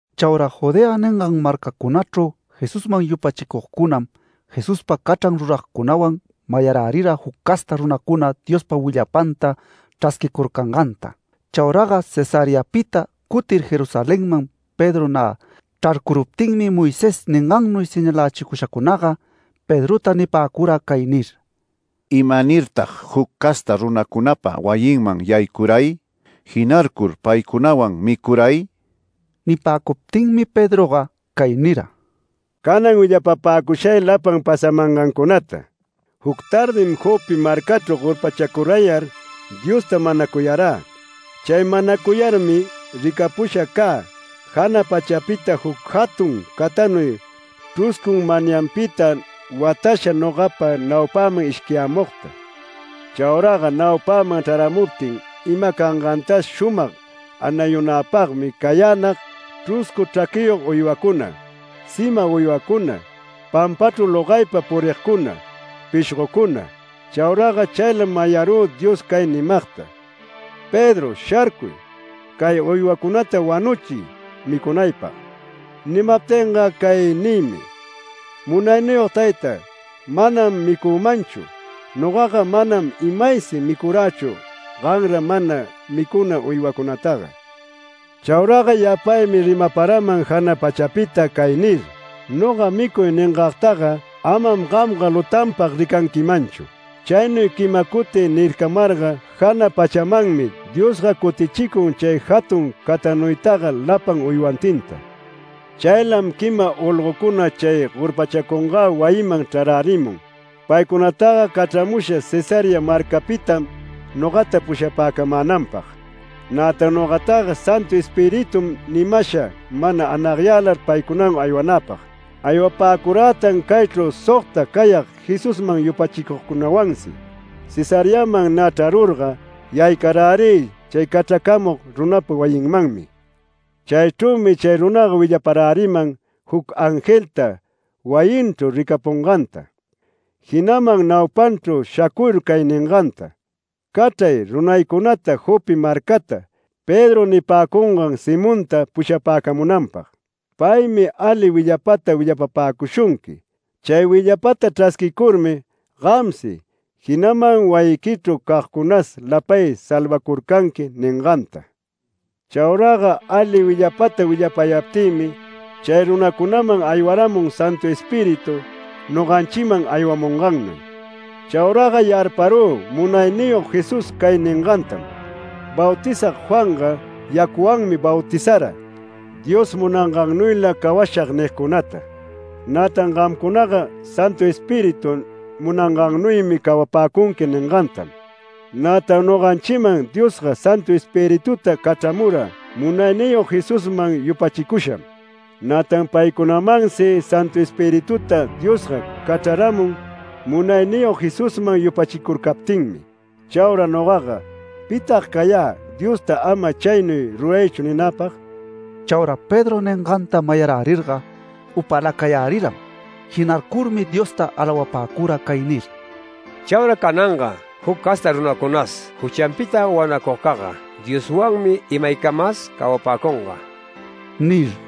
Chauraga Judea ningan marcacunachru Jesusman yupachicugcunam, Jesuspa cachran ruragcunawan mayarärira juc casta runacuna Diospa willapanta chrasquicurcanganta. Chauraga Cesareapita cutir Jerusalenman Pedro nä chrarcuruptinmi Moisés ningannuy señalächicushacunaga Pedrota nipäcura cay nir: “¿Imanirtag juc casta runacunapa wayinman yaycuray, jinarcur paycunawan micuray?” Nipäcuptinmi Pedroga cay nira: “Canan willapapäcushay lapan pasamangancunata. Juc tardim Jope marcachru gorpachacurayar, Diosta manacuyarä. Chay manacuyarmi ricapusha cä jana pachapita juc jatun catanuy chruscun manyanpita watasha nogapa naupäman ishquiyämugta. Chauraga naupäman chraramuptin ima cangantas shumag anayunäpagmi cayänag chruscu chraquiyog uywacuna, sima uywacuna, pampachru logaypa purigcuna, pishgocuna. Chauraga chaylam mayarü Dios cay nimagta: ‘Pedro, sharcuy, cay uywacunata wanuchiy micunaypag’. Nimaptinga cay nïmi: ‘Munayniyog tayta, manam micümanchu. Nogaga manam imaysi micurächu ganra mana micuna uywacunataga’. Chauraga yapaymi rimaparaman jana pachapita cay nir: ‘Noga “Micuy” ningagtaga amam gamga lutanpag ricanquimanchu’. Chaynuy quima cuti nircamarga jana pachamanmi Diosga cutichicun chay jatun catanuytaga lapan uywantinta. Chaylam quima olgocuna chay gorpachacungä wayiman chrarärimun. Paycunataga cachramusha Cesarea marcapitam nogata pushapäcamänanpag. Nätan nogataga Santu Espiritum nimasha mana anagyälar paycunawan aywanäpag. Aywapäcurätan caychru sogta cayag Jesusman yupachicugcunawansi. Cesareaman nä chrarurga, yaycarärï chay cachracamug runapa wayinmanmi. Chaychrümi chay runaga willaparäriman juc angelta wayinchru ricapunganta. Jinaman naupanchru shacuyur cay ninganta: ‘Cachray runaycunata Jope marcata Pedro nipäcungan Simonta pushapäcamunanpag. Paymi ali willapata willapapäcushunqui. Chay willapata chrasquicurmi gamsi, jinaman wayiquichru cagcunas lapay salvacurcanqui’ ninganta. Chauraga ali willapata willapayaptïmi chay runacunaman aywaramun Santu Espíritu noganchiman aywamungannuy. Chauraga yarparü Munayniyog Jesús cay ningantam: ‘Bautizag Juanga yacuwanmi bautizara, Dios munangannuyla cawashag nigcunatam. Nätan gamcunaga Santu Espíritu munangannuymi cawapäcunqui’ ningantam. Nätan noganchiman Diosga Santu Espirituta cachramura Munayniyog Jesusman yupachicusham. Nätan paycunamansi Santu Espirituta Diosga cachraramun Munayniyog Jesusman yupachicurcaptinmi. Chaura nogaga ¿pitag cayä Diosta ‘Ama chaynuy ruraychu’ ninäpag?” Chaura Pedro ninganta mayarärirga upäläcayäriram. Jinarcurmi Diosta alawapäcura cay nir: “¡Chaura cananga juc casta runacunas juchanpita wanacugcagga Dioswanmi imaycamas cawapäcunga!” nir.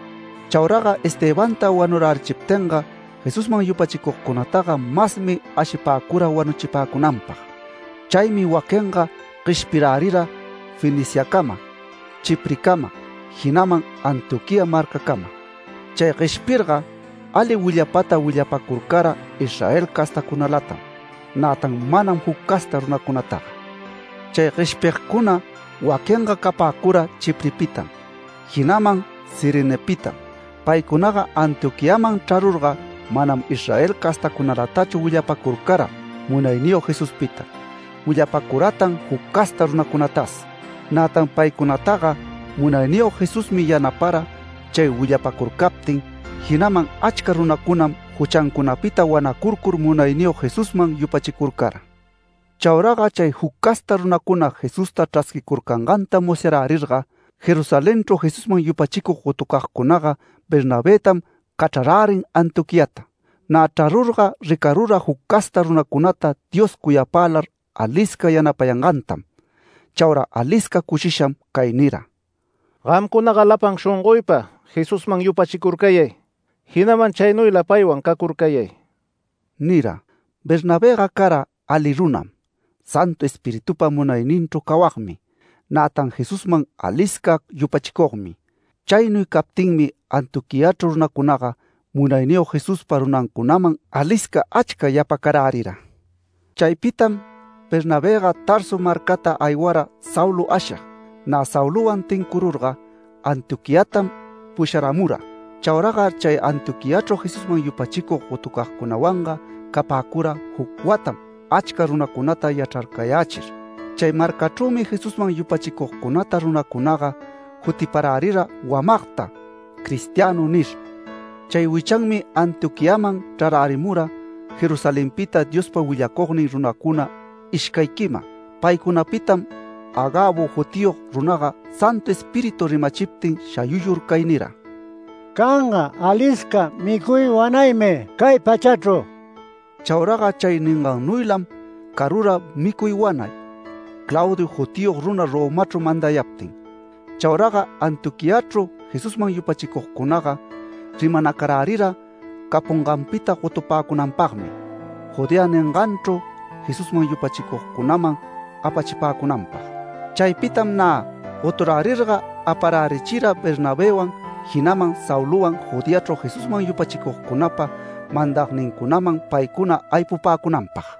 Chauraga Estebanta wanurärichiptinga Jesusman yupachicugcunataga masmi ashipäcura wanuchipäcunanpag. Chaymi waquinga gueshpirärira Feniciacama, Chiprecama, jinaman Antioquía marcacama. Chay gueshpirga ali willapata willapacurcara Israel castacunalatam, nätan manam juc casta runacunataga. Chay gueshpigcuna waquinga capäcura Chiprepitam, jinaman Cirenepitam. Paycunaga Antioquiaman chrarurga manam Israel castacunalatachu willapacurcara Munayniyog Jesuspita, willapacuratan juc casta runacunatas. Nätan paycunataga Munayniyog Jesusmi yanapara chay willapacurcaptin, jinaman achca runacunam juchancunapita wanacurcur Munayniyog Jesusman yupachicurcara. Chauraga chay juc casta runacuna Jesusta chrasquicurcanganta musyarärirga, Jerusalenchru Jesusman yupachicug gotucagcunaga Bernabëtam cachrarärin Antioquiata. Nä chrarurga ricarura juc casta runacunata Dios cuyapälar alisca yanapayangantam. Chaura alisca cushisham cay nira: “Gamcunaga lapan shongoypa Jesusman yupachicurcayay, jinaman chaynuyla paywan cacurcayay” nira. Bernabëga cara ali runam, Santu Espiritupa munayninchru cawagmi, nätan Jesusman alisca yupachicugmi. Chaynuy captinmi Antioquiachru runacunaga Munayniyog Jesuspa runancunaman alisca achca yapacarärira. Chaypitam Bernabëga Tarso marcata aywara Saulo ashig. Nä Saulowan tincururga Antioquiatam pusharamura. Chauraga chay Antioquiachru Jesusman yupachicug gotucagcunawanga capäcura juc watam achca runacunata yachrarcayächir. Chay marcachrümi Jesusman yupachicugcunata runacunaga jutiparärira wamagta “Cristiano” nir. Chay wichanmi Antioquiaman chrarärimura Jerusalenpita Diospa willacugnin runacuna ishcay quima. Paycunapitam Agabo jutiyog runaga Santu Espíritu rimachiptin shayuyur cay nira: “Canga alisca micuy wanaymi cay pachachru”. Chauraga chay ningannuylam carura micuy wanay, Claudio jutiyog runa Romachru mandayaptin. Chauraga Antioquiachru Jesusman yupachicugcunaga rimanacarärira capunganpita gotupäcunanpagmi, Judea ninganchru Jesusman yupachicugcunaman apachipäcunanpag. Chaypitam nä goturärirga aparärichira Bernabëwan, jinaman Saulowan Judeachru Jesusman yupachicugcunapa mandagnincunaman paycuna aypupäcunanpag.